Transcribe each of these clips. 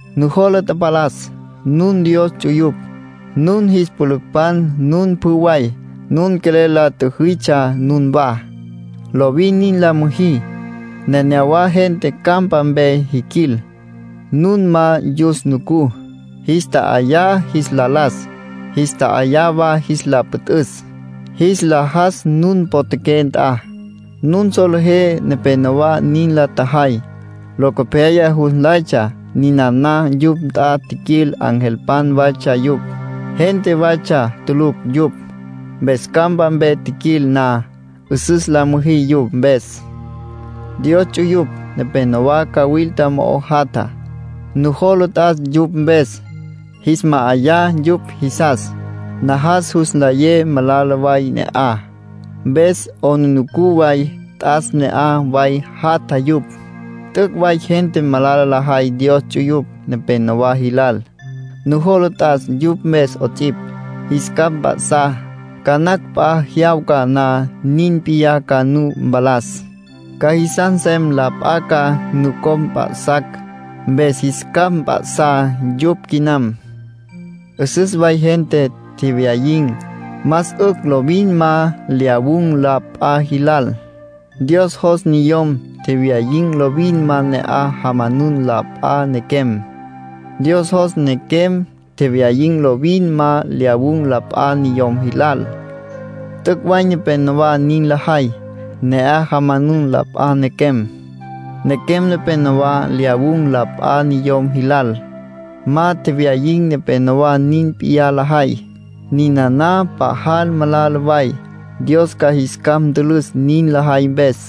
Nujola tapalas, nun Dios ts'uyupj, nun jis pülücpan nun pjü way. Nun quelel la tjüjitsja nunwá. Lovin nin la müjí. Nenéyawa gente campa mpe jiquil, nun ma yus nucú. Jis tja'ayá jis la las, jis tja'ayá wa jis la püt'üs, jis la jas nun potjaqué nt'a. Nun solejé nepénowa nin la tjajay. Locopyaya jus nlaytsja ninana yupj nt'a tjiquil angelpan waytsja yupj, gente waytsja tulucj yupj. Mpes campa mpe jiquil na, 'üsüs la müjí yupj mpes. Dios ts'uyupj nepenowá cawilta mo'o jatja. Nujola t'as yupj mpes, jis ma'ayá yupj jisas. Najas jus nlayé malala way ne'aj. Mpes 'aplijila way t'as ne'aj way jatja yupj. T'üc' way gente malala lajay Dios ts'uyupj nepenowá jilal. Nujola t'as yupj mpes 'ots'ipj, jis capj mp'a'sá. Ca nacj p'a jyawca na nin p'iyá ca nu mpalas. Ca jisas nsem la p'a ca nucopj mp'a'sacj. Mpes jis capj mp'a'sá yupj quinam. 'Üsüs way gente tjewyayin̈. Más 'ücj lovin ma lyawun̈ la p'a jilal. Dios jos niyom tjewyayin̈ lovin ma ne'aj jamanun la p'a nequem. Dios jos nequem tjewyayin̈ lovin ma lyawun̈ la p'a niyom jilal. T'üc' way nepénowa nin lajay, ne'aj jamanun la p'a nequem. Nequem nepénowa lyawun̈ la p'a niyom jilal. Ma tjewyayin̈ nepénowa nin p'iyá lajay. Ninana pajal malala way, Dios ca jis capj ntülüs nin lajay mpes.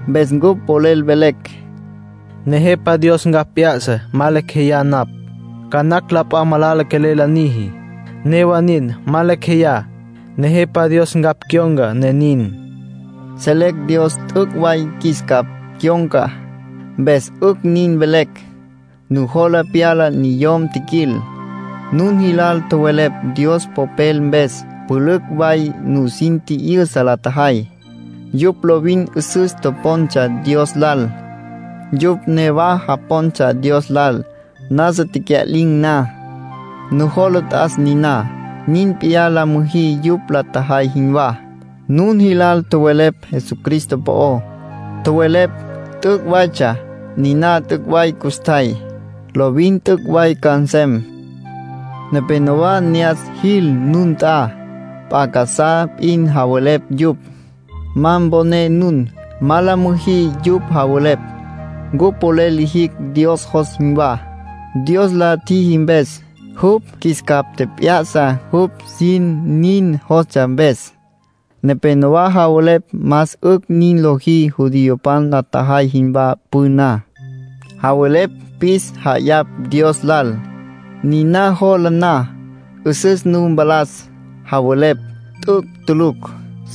Mpes cupj polel velecj: “Nejepa Dios ncapj p'ya'sa. Ma lecj jeyá napj. Ca nacj la p'a malala quelel la niji; newa nin, ma lecj jeyá, Nejepa Dios ncapj cyon̈ca, ne nin.” Selecj Dios t'üc' way qjuis capj cyon̈ca, mpes 'ücj nin velecj. Nujola pyala niyom tjiquil, nun jilal tjowelepj Dios Popel mpes. Pülücj way nusin tji'yüsa la tjajay. Yupj lovin 'üsüs topontsja Dios lal. Yupj newa japontsja Dios lal, nasa tecya'lin̈ na. Nujola t'as niná. Nin p'iyá la müjí yupj la tjajay jinwá. Nun jilal tjowelepj Jesucristo po'ó. Tjowelepj t'üc' waytsja. Niná t'üc' way custjay. Lovin t'üc' way ca nsem. Nepénowa ne'as jil nun nt'a, p'a casá p'in javelepj yupj. Ma mponé nun. Ma la müjí yupj javelepj. Cupj polel lijicj Dios jos jinwá, Dios la tjiji mpes. Jupj qjuis capj tjep'ya'sa jupj sin nin jostsja mpes. Nepénowa javelepj más 'ücj nin lojí judiopan la tjajay jinwá püná. Javelepj pis ja'ayapj Dios lal; niná lojá na, 'üsüs nu mpalas, javelepj. T'üc' tulucj.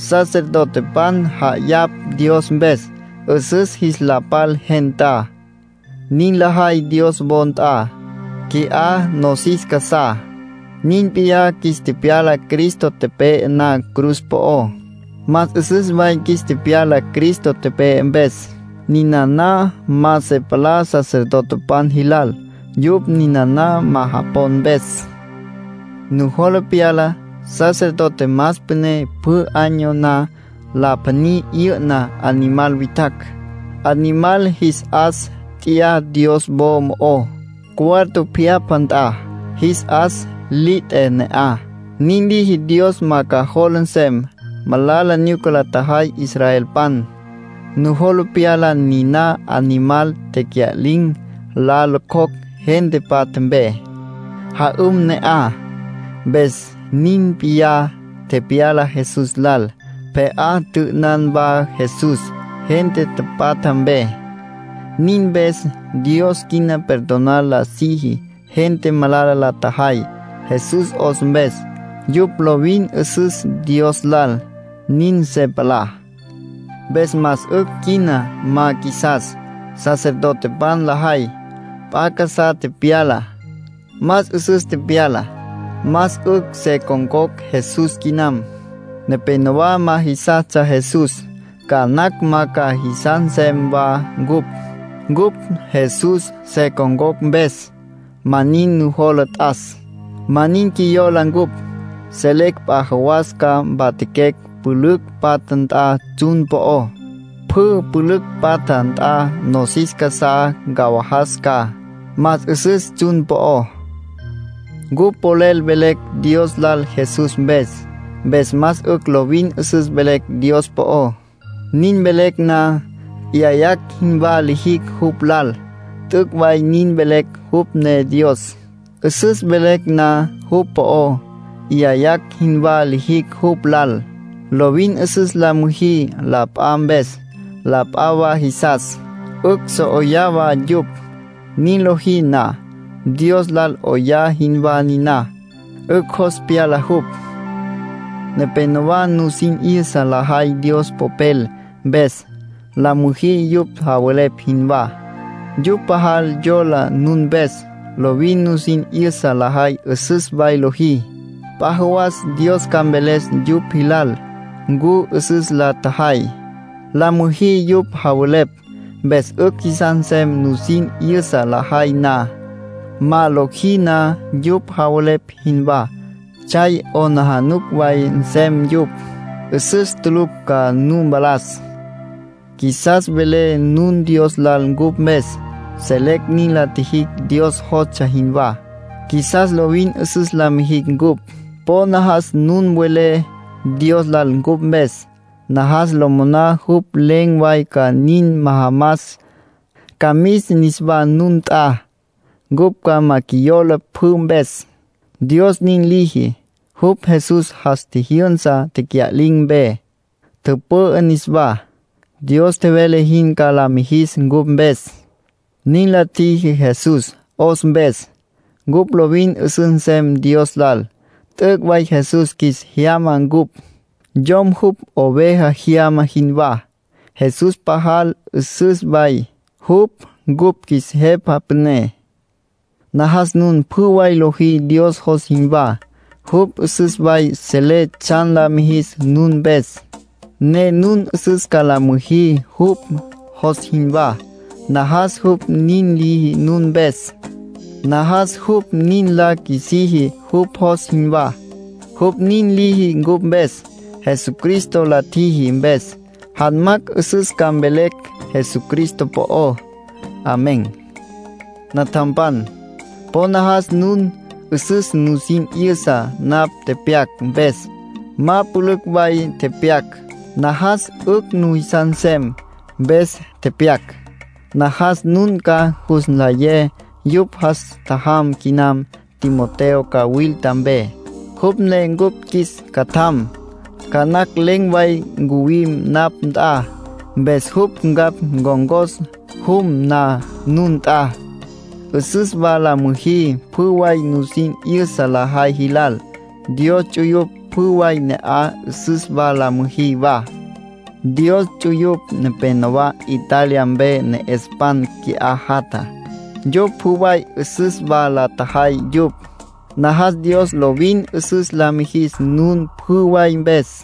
Sacerdotepan ja'ayapj Dios mpes, 'üsüs jis la pal gentá. Nin lajay Dios wo nt'a, qui'á nosis casá. Nin p'iyá qjuis tepyala Cristo tepe'e na cruz po'ó. Más 'üsüs way qjuis tepyala Cristo tepe'e mpes. Ninana ma se palá sacerdotepan jilal, yupj ninana ma japon mpes. Nujola pyala sacerdote más püné pjü año na la pjaní 'yü'na animal witjacj, animal jis 'as t'ya Dios wo mo'ó, cuarto pjyapja nt'a. Jis 'as li t'e ne'aj. Nin liji Dios ma ca jola nsem malala nyuca la tjajay israelpan. Nujola pyala niná animal tecya'lin̈ la locjocj gente patja mpe, ja'üm ne'aj. Mpes nin p'iyá tepyala Jesús lal. Pje'á tjü'ünan wa Jesús gente tapatja mpe. Nin mpes, Dios quina perdonar la siji gente malala la tjajay, Jesús 'os mpes. Yupj lovin 'üsüs Dios lal, nin se palá. Mpes más 'ücj quina ma qjuisas sacerdotepan lajay. P'a casá tepyala, más 'üsüs tepyala. Más 'ücj se con̈cocj Jesús quinam. Nepénowa ma jisastsja Jesús. Ca nacj ma ca jisas nsem wa cupj, cupj Jesús se con̈cocj mpes. Ma nin nujola t'as. Ma nin qjuiyola cupj; selecj p'a jawas ca mpatjaquecj pülücj patja nt'a tsjun po'ó. Pjü pülücj patja nt'a nosis casá ncawajas ca. Más 'üsüs tsjun po'ó. Cupj polel velecj Dios lal Jesús mpes. Mpes más 'ücj lovin 'üsüs velecj Dios po'ó. Nin velecj na, 'yayacj jinwá lijicj jupj lal. T'üc' way nin velecj jupj ne Dios. 'Üsüs velecj na jupj po'ó, 'yayacj jinwá lijicj jupj lal. Lovin 'üsüs la müjí la p'a mpes. La p'a wa jisas, 'ücj so 'oyá wa yupj. Nin lojí na, Dios lal 'oyá jinwá niná. 'Ücj jos pyala jupj. Nepénowa nusin 'yüsa lajay Dios Popel mpes; la müjí yupj javelepj jinwá. Yupj pajal yola nun mpes, lovin nusin 'yüsa lajay 'üsüs way lojí. P'a jawas Dios ca mveles yupj jilal ncu 'üsüs la tjajay. La müjí yupj javelepj, mpes 'ücj jisas nsem nusin 'yüsa lajay na. Ma lojí na yupj javelepj jinwá, tsjay 'aplijila way nsem yupj. 'Üsüs tulucj ca nu mpalas. Qjuisas mvelé nun Dios lal cupj mpes. Selecj nin la tjijicj Dios jostsja jinwá. Qjuisas lovin 'üsüs la mijicj cupj. Po najas nun welé Dios lal cupj mpes. Najas lo moná jupj len̈ way ca nin majamas, ca mis niswá nun nt'a. Cupj ma qjuiyola pjü mpes, Dios nin liji. Jupj Jesús jas tjijyünsa tecya'lin̈ mpe, tüpü'ü niswá. Dios tjevele jin ca la mijis cupj mpes. Nin la tjiji Jesús 'os mpes, cupj lovin 'üsüs nsem Dios lal. T'üc' way Jesús qjuis jyama cupj, yom jupj oveja jyama jinwá. Jesús pajal 'üsüs way, jupj cupj qjuis Jepa Püné. Najas nun pjü way lojí Dios jos jinwá. Jupj 'üsüs way selé tsjan la mijis nun mpes, ne nun 'üsüs ca la müjí jupj jos jinwá. Najas jupj nin liji nun mpes. Najas jupj nin la qjuisiji jupj jos jinwá. Jupj nin liji cupj mpes, Jesucristo la tjiji mpes. Janmacj 'üsüs ca mvelecj Jesucristo po'ó. Amén. Natjampan, po najas nun 'üsüs nusin 'yüsa napj tepyac mpes. Ma pülücj way tepyac. Najas 'ücj nujisas nsem, mpes tepyac. Najas nun ca jus nlayé yupj jas tjajam quinam Timoteo cawilta mpe, jupj ne cupj qjuis catjam. Ca nacj len̈ way ncuwim napj nt'a, mpes jupj ncapj ncon̈cos jum na nun nt'a. Süs wa la müjí pjü way nusin 'yüsa lajay jilal. Dios ts'uyupj pjü way ne'aj süs wa la müjí wa. Dios ts'uyupj nepénowa Italia mpe ne'espan qui'á jatja. Yupj pjü way süs wa la tjajay yupj. Najas Dios lovin 'üsüs la mijis nun pjü way mpes.